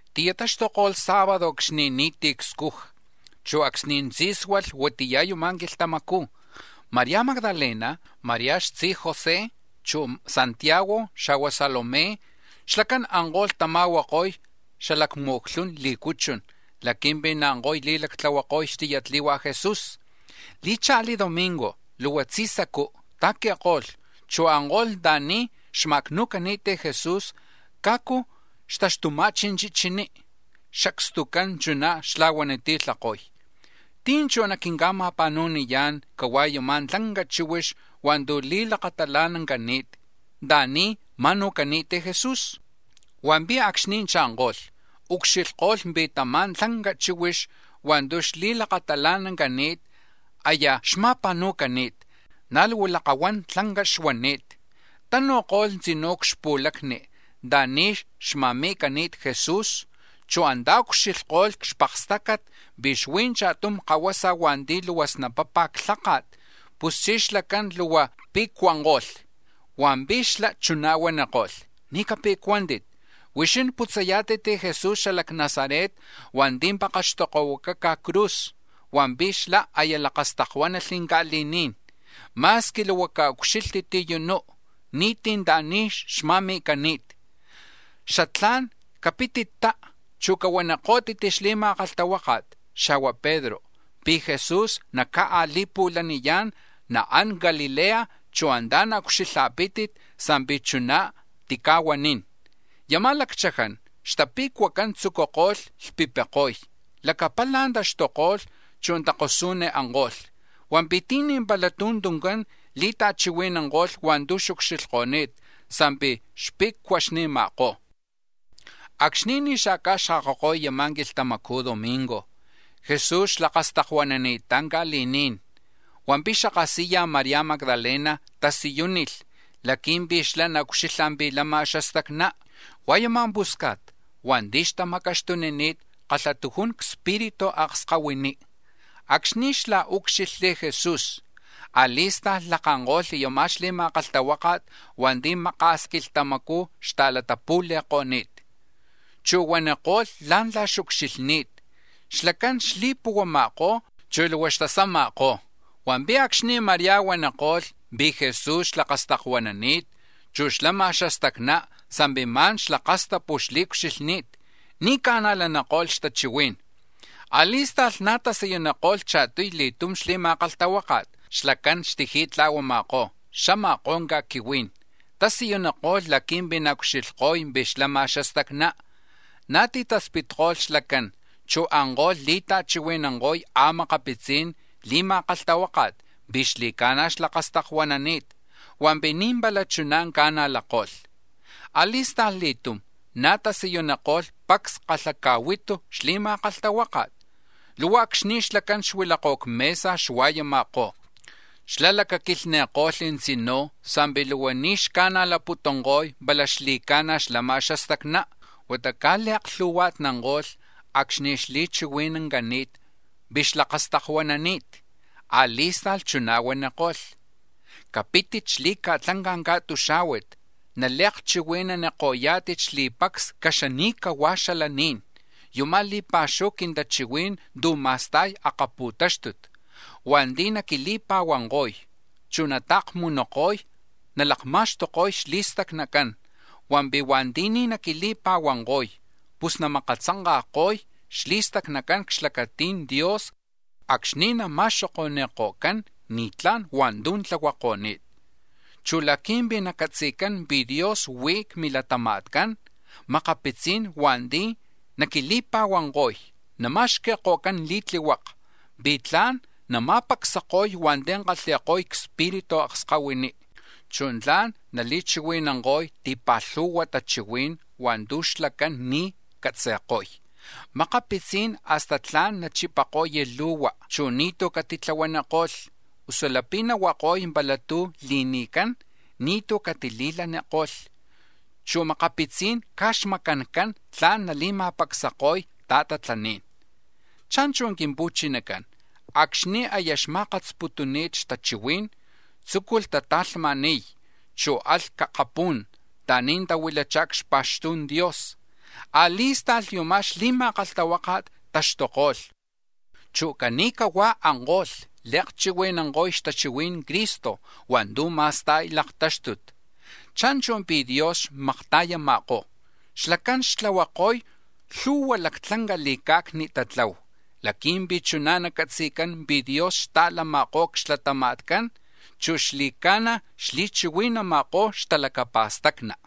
Ti̱yataxtuko̱lh sábado acxni̱ ni̱tí̱ cscuja, chu̱ acxni̱ tzí̱sualh huatiya̱ yama̱ quilhtamacú̱, María Magdalena, María xtzi José chu̱ Santiago, xa̱hua̱ Salomé, xlacán anko̱lh tama̱huako̱y xamu̱clhun lí̱cuchun laqui̱mpi̱ naanko̱y li̱lactlahuako̱y xtiyatli̱hua Jesús. Li̱cha̱li̱ domingo, luhua tzi̱sacú̱ ta̱qui̱ko̱lh, chu̱ anko̱lh anta̱ni̱ xma̱acnu̱cani̱t Jesús cajcu xtaxtuma̱chi̱ chichiní. Xacstucán chuná̱ xla̱huaniti̱lhako̱y: —¿Tí̱ chú̱ naquinca̱ma̱pa̱nu̱niyá̱n cahuá̱ yama̱ tlanca chíhuix hua̱ntu̱ li̱lakatalanancani̱t anta̱ni̱ ma̱nu̱cani̱t Jesús? Hua̱mpi̱ acxni̱ cha̱nko̱lh, ucxilhko̱lh pi̱ tama̱ tlanca chíhuix hua̱ntu̱ xli̱lakatalanancani̱t, aya xma̱pa̱nu̱cani̱t, na̱ luhua lakahuan lanca xuani̱t. Tanu̱ko̱lh tzinú̱ c-xpu̱lacni anta̱ni̱ xma̱mi̱cani̱t Jesús, chu̱ antá̱ ucxilhkolh c-xpakstácat pi̱ xuí̱ cha̱tum kahuasa hua̱nti̱ luhua snapapa̱ xlháka̱t. Puschí̱ xlacán luhua tipe̱cuanko̱lh. Hua̱mpi̱ xlá̱ chuná̱ huaniko̱lh: —Ni̱ cape̱cuántit. Huixín putzayá̱tit Jesús xala c-Nazaret hua̱nti̱ pakaxtokohuacaca̱ c-cruz. Hua̱mpi̱ xlá̱ aya lakastakuánalh ca̱li̱ní̱n. Ma̱squi luhua caucxílhtit u̱nú, ni̱tí̱ anta̱ni̱ xma̱mi̱cani̱t. Xatlá̱n capitittá, chu̱ cahuaniko̱pítit xli̱ma̱kalhtahuáka̱t, xa̱hua̱ Pedro, pi̱ Jesús naca̱a̱li̱pu̱laniyá̱n, naán c-Galilea, chu̱ antá̱ naucxilha̱pí̱tit sa̱mpi̱ chuná̱ tica̱huanín. Yama̱ lacchaján xtape̱cuacán tzucuko̱lh lhpipiko̱y; lacapala̱ taxtuko̱lh, chu̱ takosú̱n anko̱lh. Hua̱mpi̱ ti̱ni̱ pala tú̱ tuncán li̱ta̱chihui̱nanko̱lh hua̱ntu̱ xucxilhko̱ni̱t sa̱mpi̱ xpe̱cuaxni̱ma̱kó̱. Acxni̱ ni̱ xa̱ca̱xkakako̱y yama̱ quilhtamacu̱ domingo, Jesús xlakastakuanani̱ttá̱ ca̱li̱ní̱n; hua̱mpi̱ xapu̱lana̱ María Magdalena tasiyúnilh laqui̱mpi̱ xlá̱ naucxilha̱ pi̱ lama̱ xastacná. Hua̱ yuma̱ pusca̱t hua̱nti̱ xtamacaxtunini̱t kalhatujun cspiritu akskahuiní. Acxni̱ xlá̱ úcxilhli̱ Jesús, a̱li̱sta̱lh lakanko̱lh yama̱ xli̱ma̱kalhtahuáka̱t hua̱nti̱ maka̱s quilhtamacú̱ xta̱latapu̱la̱ko̱ni̱t, chu̱ huaniko̱lh la̱ntla̱ xucxilhni̱t; xlacán xli̱puhuama̱kó̱, chu̱ luhua xtasama̱kó̱. Hua̱mpi̱ acxni̱ María huaniko̱lh pi̱ Jesús xlakastakuanani̱t, chu̱ xlama̱ xastacná sa̱mpi̱ ma̱n xlakastapu̱ xli̱ucxilhni̱t, ni̱ ca̱najlaniko̱lh xtachihuí̱n. A̱li̱sta̱lh na̱ tasiyuniko̱lh cha̱tuy li̱tum xli̱ma̱kalhtahuáka̱t, xlacán xtiji̱tla̱huama̱kó̱, xama̱kó̱ ca̱quihuí̱n, tasiyuniko̱lh laqui̱mpi̱ naucxilhko̱y pi̱ xlama̱ xastacná. Na̱ titaspitko̱lh xlacán, chu̱ anko̱lh li̱ta̱chihui̱nanko̱y a̱makapitzi̱n li̱ma̱kalhtahuáka̱t pi̱ xli̱ca̱na̱ xlakastakuanani̱t. Hua̱mpi̱ ni̱ pala chuná̱ ca̱najlako̱lh. A̱li̱sta̱lh li̱tum na̱ tasiyuniko̱lh pacs kalhaca̱huitu xli̱ma̱kalhtahuáka̱t luhua acxni̱ xlacán xuilakó̱ c-mesa xua̱yama̱kó̱. Xlá̱ lacaquilhni̱ko̱lh tzinú̱ sa̱mpi̱ luhua ni̱ xca̱najlaputunko̱y pala xli̱ca̱na̱ xlama̱ xastacná, huata caj li̱aklhu̱hua̱tnanko̱lh acxni̱ xli̱chihui̱nancani̱t pi̱ xlakastakuanani̱t. A̱li̱sta̱lh chuná̱ huaniko̱lh: —Capítit xli̱ca̱tlanca̱ ca̱tuxá̱huat, nali̱akchihui̱naniko̱yá̱tit xli̱pacs caxani̱cahua̱ xalaní̱n yuma̱ li̱pa̱xuhu quintachihuí̱n tu̱ ma̱sta̱y akapu̱táxtut. Hua̱nti̱ naquili̱pa̱huanko̱y, chu̱ nata̱kmunuko̱y nalakma̱xtuko̱y xli̱stacnacán, hua̱mpi̱ hua̱nti̱ ni̱ naquili̱pa̱huanko̱y, pus namakatzanka̱ko̱y xli̱stacnacán c-xlacati̱n Dios acxni̱ nama̱xoko̱ni̱ko̱cán ni̱tlá̱n hua̱ntu̱ tlahuako̱ni̱t. Chu̱ laqui̱mpi̱ nacatzi̱cán pi̱ Dios huí̱ c-milatama̱tcán makapitzí̱n hua̱nti̱ naquili̱pa̱huanko̱y nama̱xqui̱ko̱cán li̱tlihuaka̱ pi̱ tla̱n nama̱pacsako̱y hua̱nti̱ kalhi̱ko̱y cspiritu akskahuiní, chu̱ tla̱n nali̱chihui̱nanko̱y ti̱pa̱lhu̱hua tachihuí̱n hua̱ntu̱ xlacán ni̱ catzi̱ko̱y. Makapitzí̱n hasta tla̱n nachipako̱y lu̱hua, chu̱ ni̱tú̱ catitlahuaniko̱lh, usu lapi̱ nahuako̱y pala tu̱ li̱ni̱cán, ni̱tú̱ catili̱laniko̱lh, chu̱ makapitzí̱n caj xmacancán tla̱n nali̱ma̱pacsako̱y ta̱tatlaní̱n. Cha̱nchu̱ Quimpu̱chinacán, acxni̱ aya xma̱katsputuni̱t xtachihuí̱n, tzúculh tata̱lhma̱ni̱y, chu̱ alh c-akapú̱n anta̱ni̱ tahuilachá̱ c-xpa̱xtu̱n Dios. A̱li̱sta̱lh, yama̱ xli̱ma̱kalhtahuáka̱t taxtuko̱lh, chu̱ cani̱cahuá̱ anko̱lh li̱akchihui̱nanko̱y xtachihui̱n Cristo hua̱ntu̱ ma̱sta̱y laktáxtut. Cha̱nchu̱ pi̱ Dios xmakta̱yama̱kó̱, xlacán xtlahuako̱y lhu̱hua̱ lactlanca li̱ca̱cni tatlahu laqui̱mpi̱ chuná̱ nacatzi̱cán pi̱ Dios xta̱lama̱kó̱ c-xlatama̱tcán, chu̱ xli̱ca̱na̱ xli̱chihui̱nama̱kó̱ xtalacapa̱stacni.